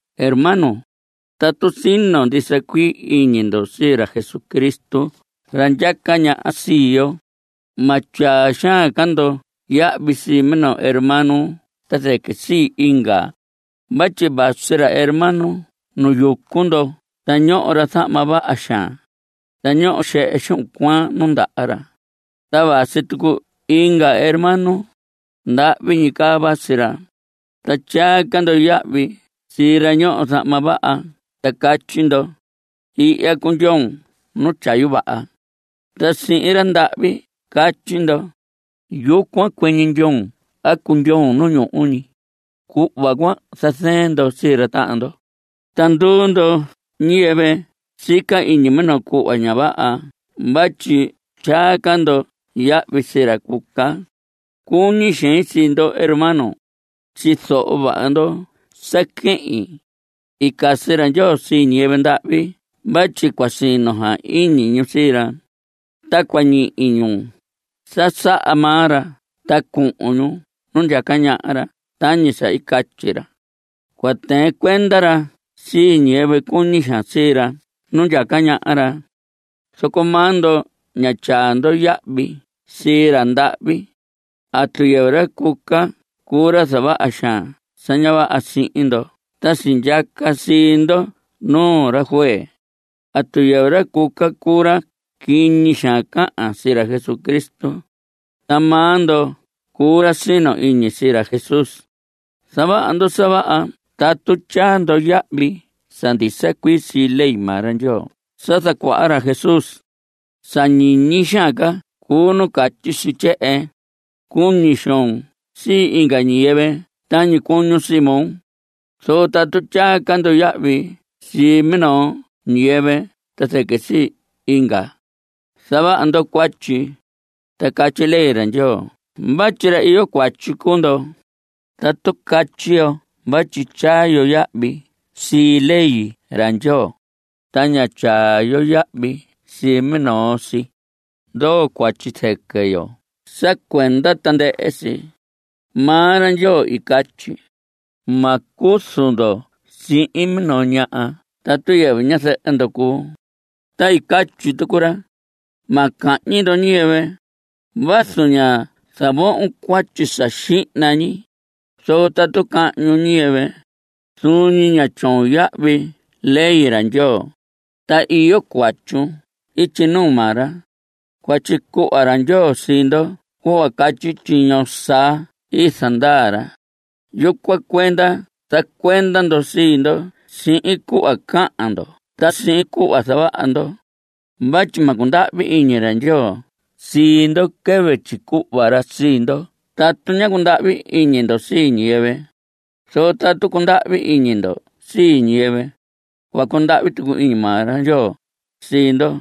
Hermanos, tatu sino ndisa cuii iñi ndo sii ra Jesucristo ra ndyaca ñaha sii yo, ma tyaa xaan ca ndo yahvi sii minoo hermano ta zɨquɨ sii inga. Vatyi vasi ra hermano nu yucu ndo ta ñoho ra zahma vaha xaan, ta ñoho xehe xuhun cuaan nu ndaha ra. Ta vasi tucu inga hermano, ndahvi ñi caa vasi ra. Ta tyaa ca ndo yahvi sii ra ñoho zahma vaha ta catyi ndo: “Ihya cundyoon nu tyayu vaha.” Ta sihin ra ndahvi catyi ndo: “Yucuan cuɨñɨ ndyoon a cundyoon nu ñuhu ñi ña.” Cuhva cuan zazɨɨn ndo sii ra tahan ndo. Ta nduu ndo ñiyɨvɨ sica iñi minoo cuhva ña vaha vatyi tyaa ca ndo yahvi sii ra cuca. Cuñi xein sii ndo hermanos. Tyizoho vaha ndo sa quehin. I casi ra Ndyoo sii ñiyɨvɨ ndahvi vatyi cua sino xaan iñi ñu sii ra, ta cua ñihi ñu sa saha maa ra ta cuhun ñu nu ndyaca ñaha ra tañi sa i catyi ra. Cua tɨɨn cuenda ra sii ñiyɨvɨ cuñi xaan sii ra nu ndyaca ñaha ra. Zoco maa ndo ña tyaa ndo yahvi sii ra ndahvi. ¿Atu yɨvɨ ra cuca cuu ra zavaha xaan sa ña vaha sihin ndo ta sindyaca sii ndo nuu ra juez? ¿Atu yɨvɨ ra cuca cuu ra quiñi xaan cahan sii ra Jesucristo? Ta maa ndo cuu ra sino iñi sii ra Jesús. Zavaha ndo sa vaha tatu tyaa ndo yahvi sa ndisa cuii sii ley maa ra Ndyoo sa zacuaha ra Jesús. Sa ñiñi xaan ca cuu nu catyi si tyehen: “Cuñi xoon sii inga ñiyɨvɨ tañi cuñun sii moo.” Zoco tatu tyaa ca ndo yahvi sii minoo ñiyɨvɨ ta zɨquɨ sii inga, zavaha ndo cuatyi, ta catyi ley ra Ndyoo vatyi ra iyo cuatyi cuu ndo. Tatu catyi yo vatyi tyaa yo yahvi sii ley ra Ndyoo, ta ña tyaa yo yahvi sii minoo si, ndoo cuatyi zɨquɨ yo sa cuenda tandɨhɨ si. Maa ra Ndyoo i catyi: “Ma cuzu ndo sihin minoo ñaha tatu yɨvɨ ñazɨhɨ ndo cuu.” Ta i catyi tucu ra: “Ma cahñi ndo ñiyɨvɨ.” Vazu ña zavohon cuatyi sa xihna ñi, zoco tatu cahñun ñiyɨvɨ, zuun ñi ña tyoon yahvi ley ra Ndyoo, ta iyo cuatyun ityi nuu maa ra. Cua tyicuhva ra Ndyoo sii ndo cuhva catyi tyiño saa i zandaa ra. Yucuan cuenda zacuenda ndo sii ndo sihin cuhva cahan ndo ta sihin cuhva zavaha ndo. Vatyi ma cundahvi iñi ra Ndyoo sii ndo quɨvɨ tyicuhva ra sii ndo tatu ña cundahvi iñi ndo sii ñiyɨvɨ. Zoco tatu cundahvi iñi ndo sii ñiyɨvɨ, cua cundahvi tucu iñi maa ra Ndyoo sii ndo.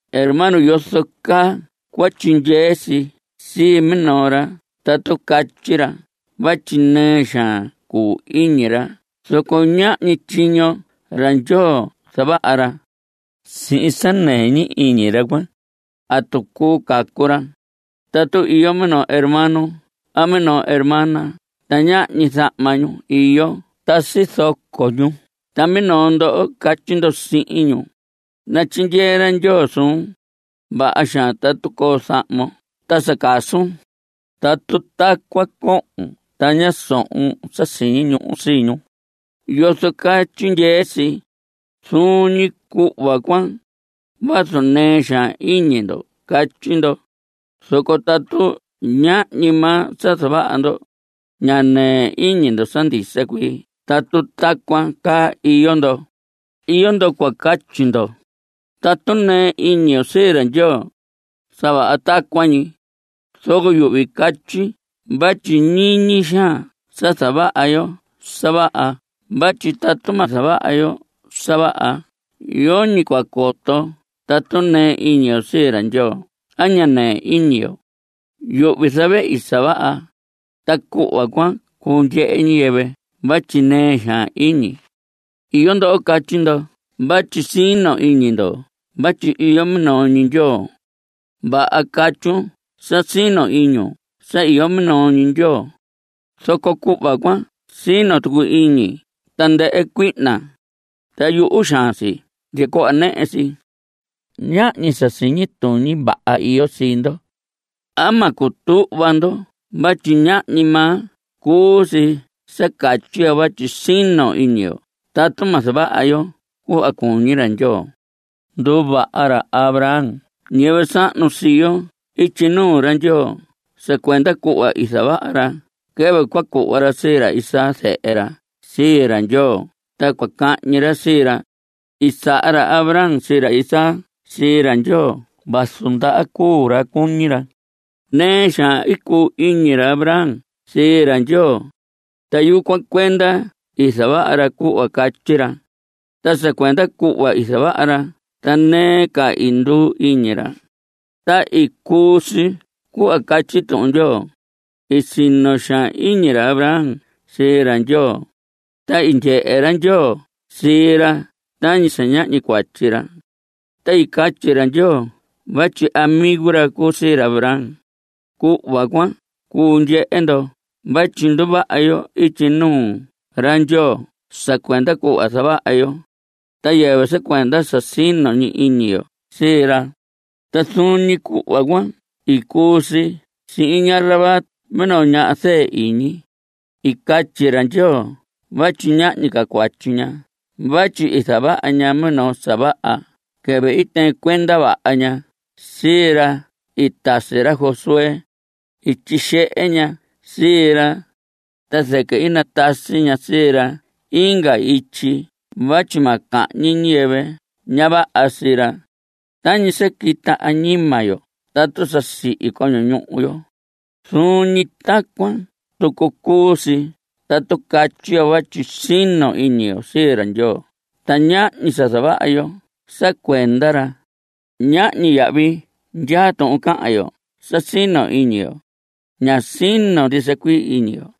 Hermanos, ¿yozo caa cua tyindyee si sii minoo ra tatu catyi ra vatyi nɨɨ xaan cuu iñi ra zoco ñahñi tyiño ra Ndyoo zavaha ra? Sihin sa nɨɨ ñi iñi ra cuan ¿atu cuu cacu ra? Tatu iyo minoo hermano a minoo hermana ta ñahñi zahma ñu iyo ta sizoco ñu ta minoo ndo catyi ndo sihin ñu: “Natyindyee ra Ndyoo suun. Vaha xaan tatu coo zahmon ta sa casun.” Tatu tacuan cohon ta ña sohon sa siñi ñuhu sii ñu ¿yozo caa tyindyee si? Zuun ñi cuhva cuan, vazu nɨɨ xaan iñi ndo catyi ndo, zoco tatu ñahñi maa sa zavaha ndo, ña nɨɨ iñi ndo sa ndisa cuii tatu tacuan caa iyo ndo. Iyo ndo cua catyi ndo: “Tatu nɨɨ iñi yo sii ra Ndyoo, sa vaha tacuan ñi.” Zoco yuhvi catyi vatyi ñiñi xaan sa zavaha yo sa vaha vatyi tatu ma zavaha yo sa vaha yoñi cua coto tatu nɨɨ iñi yo sii ra Ndyoo a ña nɨɨ iñi yo. Yuhvi zavehi sa vaha, ta cuhva cuan cuu ndyehe ñiyɨvɨ vatyi nɨɨ xaan iñi. Iyo ndo catyi ndo vatyi sino iñi ndo vatyi iyo minoo ñi Ndyoo. Vaha catyun sa sino iñun sa iyo minoo Ndyoo, zoco cuhva cuan sino tucu iñi tandɨhɨ cuihna, ta yuhu xaan si ndya cuhva nɨhɨ si. Ñahñi sa siñi tuñi vaha iyo sii ndo. ¿Ama cua cutuhva ndo vatyi ñahñi maa cuu si sa catyi yo vatyi sino iñi yo tatu ma zavaha yo cuhva cuñi ra Ndyoo? Nduvaha ra Abraham ñiyɨvɨ sahnu sii yo ityi nuu ra Ndyoo sa cuenda cuhva i zavaha ra quɨvɨ cua cuhva ra sii ra Isaac zehe ra sii ra Ndyoo ta cua cahñi ra sii ra. I saha ra Abraham sii ra Isaac sii ra Ndyoo vazu ndaha cuu ra cuñi ra. Nɨɨ xaan i cuu iñi ra Abraham sii ra Ndyoo, ta yucuan cuenda i zavaha ra cuhva i catyi ra. Ta sa cuenda cuhva i zavaha ra ta nɨɨ ca i nduu iñi ra. Ta i cuu si cuhva catyi Tuhun Ndyoo: “I sino xaan iñi ra Abraham sii ra Ndyoo, ta i ndyehe ra Ndyoo sii ra tañi sa ñahñi cuatyi ra.” Ta i catyi ra Ndyoo vatyi amigo ra cuu sii ra Abraham. Cuhva cuan cuu ndyehe ndo vatyi nduvaha yo ityi nuu ra Ndyoo sa cuenda cuhva zavaha yo, ta yɨvɨ sa cuenda sa sino ñi iñi yo sii ra. Ta zuun ñi cuhva cuan i cuu si sihin ña Rahab minoo ñaha zɨɨ iñi. I catyi ra Ndyoo vatyi ñahñi ca cuatyi ña vatyi i zavaha ña minoo sa vaha quɨvɨ i tɨɨn cuenda vaha ña sii ra i tasi ra Josué. I tyixehe ña sii ra, ta zɨquɨ i natasi ña sii ra inga ityi vatyi ma cahñi ñiyɨvɨ ña vaha sii ra. Tañi sa quita añima yo tatu sa sihi coño ñuhu yo, zuun ñi tacuan tucu cuu si tatu catyi yo vatyi sino iñi yo sii ra Ndyoo ta ñahñi sa zavaha yo sa cuenda ra. Ñahñi yahvi ndyaa tuhun cahan yo sa sino iñi yo. Ña sino ndisa cuii iñi yo.